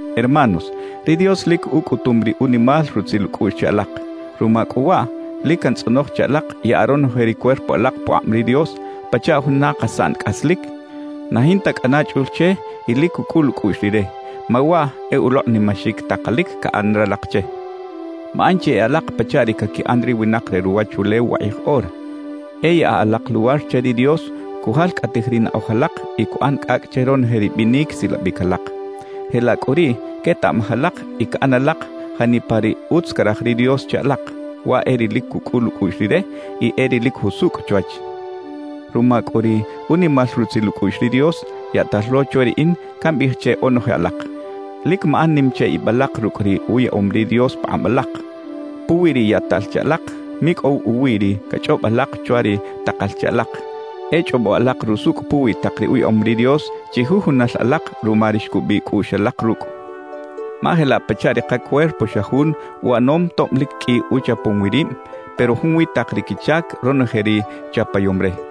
Hermanos, ri Dios lic ucꞌutum ri unimal rutzil ucꞌuꞌx che alak. Ruma cꞌu waꞌ, lic cantzꞌonoj che alak yaꞌa ronoje ri cuerpo alak pukꞌab ri Dios pachaꞌ juna kasaꞌn cꞌaslic, na jinta cꞌana chꞌul che y lic cucꞌul ucꞌuꞌx Rire; ma waꞌ e ulokꞌnimaxic takalic caꞌan ralak che. Maꞌan chi e alak pachaꞌ ri caquiꞌan ri winak re ruwachulew wakꞌij ora. E yaꞌa alak luwar che ri Dios cujalcꞌatij ri naꞌoj alak y cuꞌan cꞌacꞌ che ronoje ri binic silabic alak. Jelaꞌ cꞌu riꞌ quetaꞌmaj alak y caꞌan alak janipa ri utz caraj ri Dios che alak; waꞌ e ri lic cucꞌul ucꞌuꞌx Rire y e ri lic jusucꞌ chwach. Ruma cꞌu ri unimal rutzil ucꞌuꞌx ri Dios, yaꞌtal lo chwe riꞌin cambiꞌij che onoje alak: Lic maꞌan nim che ib alak rucꞌ ri uyaꞌom ri Dios pakꞌab alak. Puwi ri yaꞌtal che alak, micꞌow uwiꞌ ri cachꞌob alak chwa ri takal che alak; e chꞌobo alak rusucꞌ puwi tak ri uyaꞌom ri Dios chijujunal alak ruma ri xcubiꞌ cꞌuꞌx alak rucꞌ. Ma jelaꞌ pachaꞌ ri kacuerpo xa jun uꞌanom tob lic qꞌui uchapom wi rib, pero junwi tak ri quichac ronoje ri chapayom re;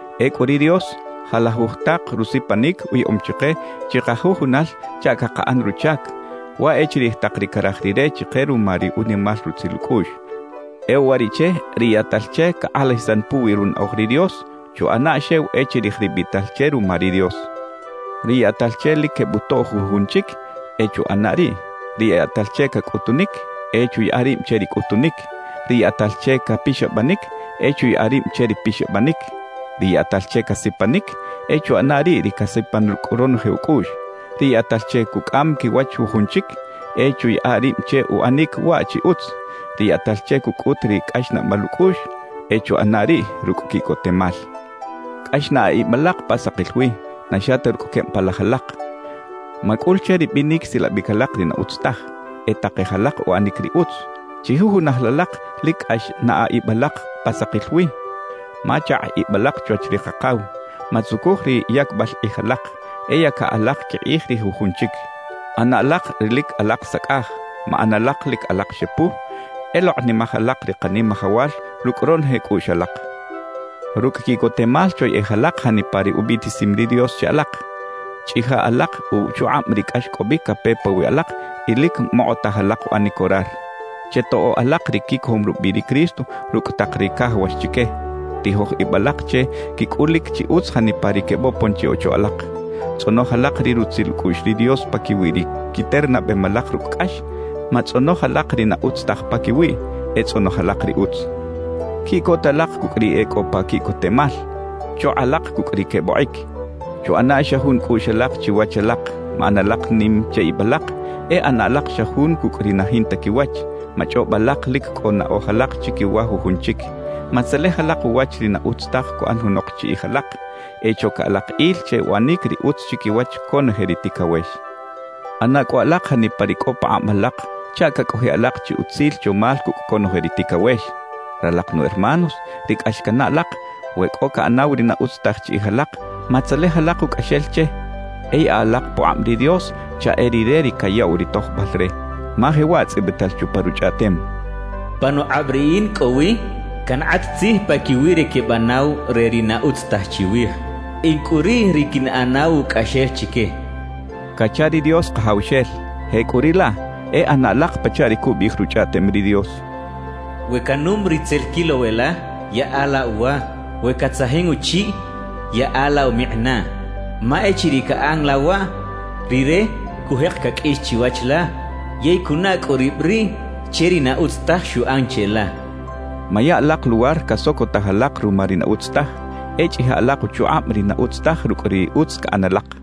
Ecꞌu ri Dios, jalajuj tak rusipanic uyaꞌom chike chikajujunal chaꞌ cakaꞌan ruchac; waꞌ e chirij tak ri caraj Rire chike ruma ri unimal rutzil ucꞌuꞌx. E uwariꞌche, ri yaꞌtal che cakꞌalajisan puwi runaꞌoj ri Dios, chuꞌana xew e chirij ri biꞌtal che ruma ri Dios. Ri yaꞌtal che lic quebutoꞌ jujun chic, e chuꞌana riꞌ. Ri yaꞌtal che cacꞌutunic, e chuyaꞌa rib che ri cꞌutunic. Ri yaꞌtal che capixabanic, e chuyaꞌa rib che ri pixabanic. Ri yaꞌtal che casipanic, e chuꞌana riꞌ ri casipan rucꞌ ronoje ucꞌuꞌx. Ri yaꞌtal che cucꞌam quiwach jujun chic, e chuyaꞌa rib che uꞌanic waꞌ chi utz. Ri yaꞌtal che cucꞌut ri cꞌaxnaꞌbal ucꞌuꞌx, e chuꞌana riꞌ rucꞌ quiꞌcotemal. Cꞌax naꞌa ib alak pa sakil wi, na xa ta rucꞌ queb palaj alak. Macꞌul che ri binic silabic alak ri na utz taj; e takej alak uꞌanic ri utz. Chijujunal alak lic cꞌax naꞌa ib alak pa sakil wi, ma chakꞌ ib alak chwach ri Kakaw. Matzucuj ri yacbal kꞌij ralak; e yaca alak quikꞌij ri jujun chic. ꞌAna alak ri lic alak sacꞌaj, maꞌan alak lic alak xepu; e lokꞌnimaj alak ri Kanimajawal rucꞌ ronoje cꞌuꞌx alak. Rucꞌ quiꞌcotemal choyeꞌej alak janipa ri ubiꞌtisim ri Dios che alak. Chꞌija alak uchukꞌab ri cꞌaxcꞌobic cape pawiꞌ alak y lic mokꞌotaj alak uꞌanic orar. Chetoꞌo alak ri quicojom rubiꞌ ri Cristo rucꞌ tak ri cajawax chique. Tijoj ib alak che quicꞌulic chi utz janipa ri quebopon chi ocho alak. Tzꞌonoj alak ri rutzil ucꞌuꞌx ri Dios paquiwi ri quiternabem alak rucꞌ cꞌax; matzꞌonoj alak ri na utz taj paquiwiꞌ, e tzꞌonoj alak ri utz. Quiꞌcota alak cucꞌ ri e cꞌo pa quiꞌcotemal; chokꞌa alak cucꞌ ri quebokꞌic. Chuꞌana xa jun cꞌuꞌx alak chiwach alak. Maꞌan alak nim che ib alak; e ꞌana alak xa jun cucꞌ ri na jinta quiwach. Machꞌob alak lic cꞌo naꞌoj alak chiquiwa jujun chic. Matzelej alak uwach ri na utz taj cuꞌan junok chiꞌij alak. E choca alak il che uꞌanic ri utz chiquiwach conoje ri ticawex. ꞌAna cꞌu alak janipa ri cꞌo pakꞌab alak chaꞌ cacꞌojiꞌ alak chi utzil chomal cucꞌ conoje ri ticawex. Ralak nu hermanos ri cꞌax cannaꞌ alak, we cꞌo caꞌanaw ri na utz taj chiꞌij alak, matzelej alak ucꞌaxel che. E yaꞌa alak pukꞌab ri Dios chaꞌ e Rire ri cayaꞌw ri tojbal re, ma jewaꞌ tzꞌibital chupa Ruchꞌaꞌtem: Panukꞌab Riꞌin cꞌo wi cankꞌat tzij paquiwi ri quebanaw re ri na utz taj chiwij; In cꞌu riꞌ ri quinꞌanaw ucꞌaxel chique cacha ri Dios Kajawxel. Jecꞌuriꞌlaꞌ, e ꞌana alak pachaꞌ ri cubiꞌij Ruchꞌaꞌtem ri Dios: We canum ri tzel quilow e la, yaꞌa la uwa. We catzajin uchiꞌ, yaꞌa la umikꞌinaꞌ. Ma echiriꞌ caꞌan la waꞌ, rire cujek caqꞌuix chiwach la yey cunaꞌ cꞌu rib riꞌ che ri na utz taj xuꞌan cheꞌla cachaꞌ. Maya alak luwar casocotaj alak ruma ri na utz taj; e chꞌija alak uchukꞌab ri na utz taj rucꞌ ri utz caꞌan alak.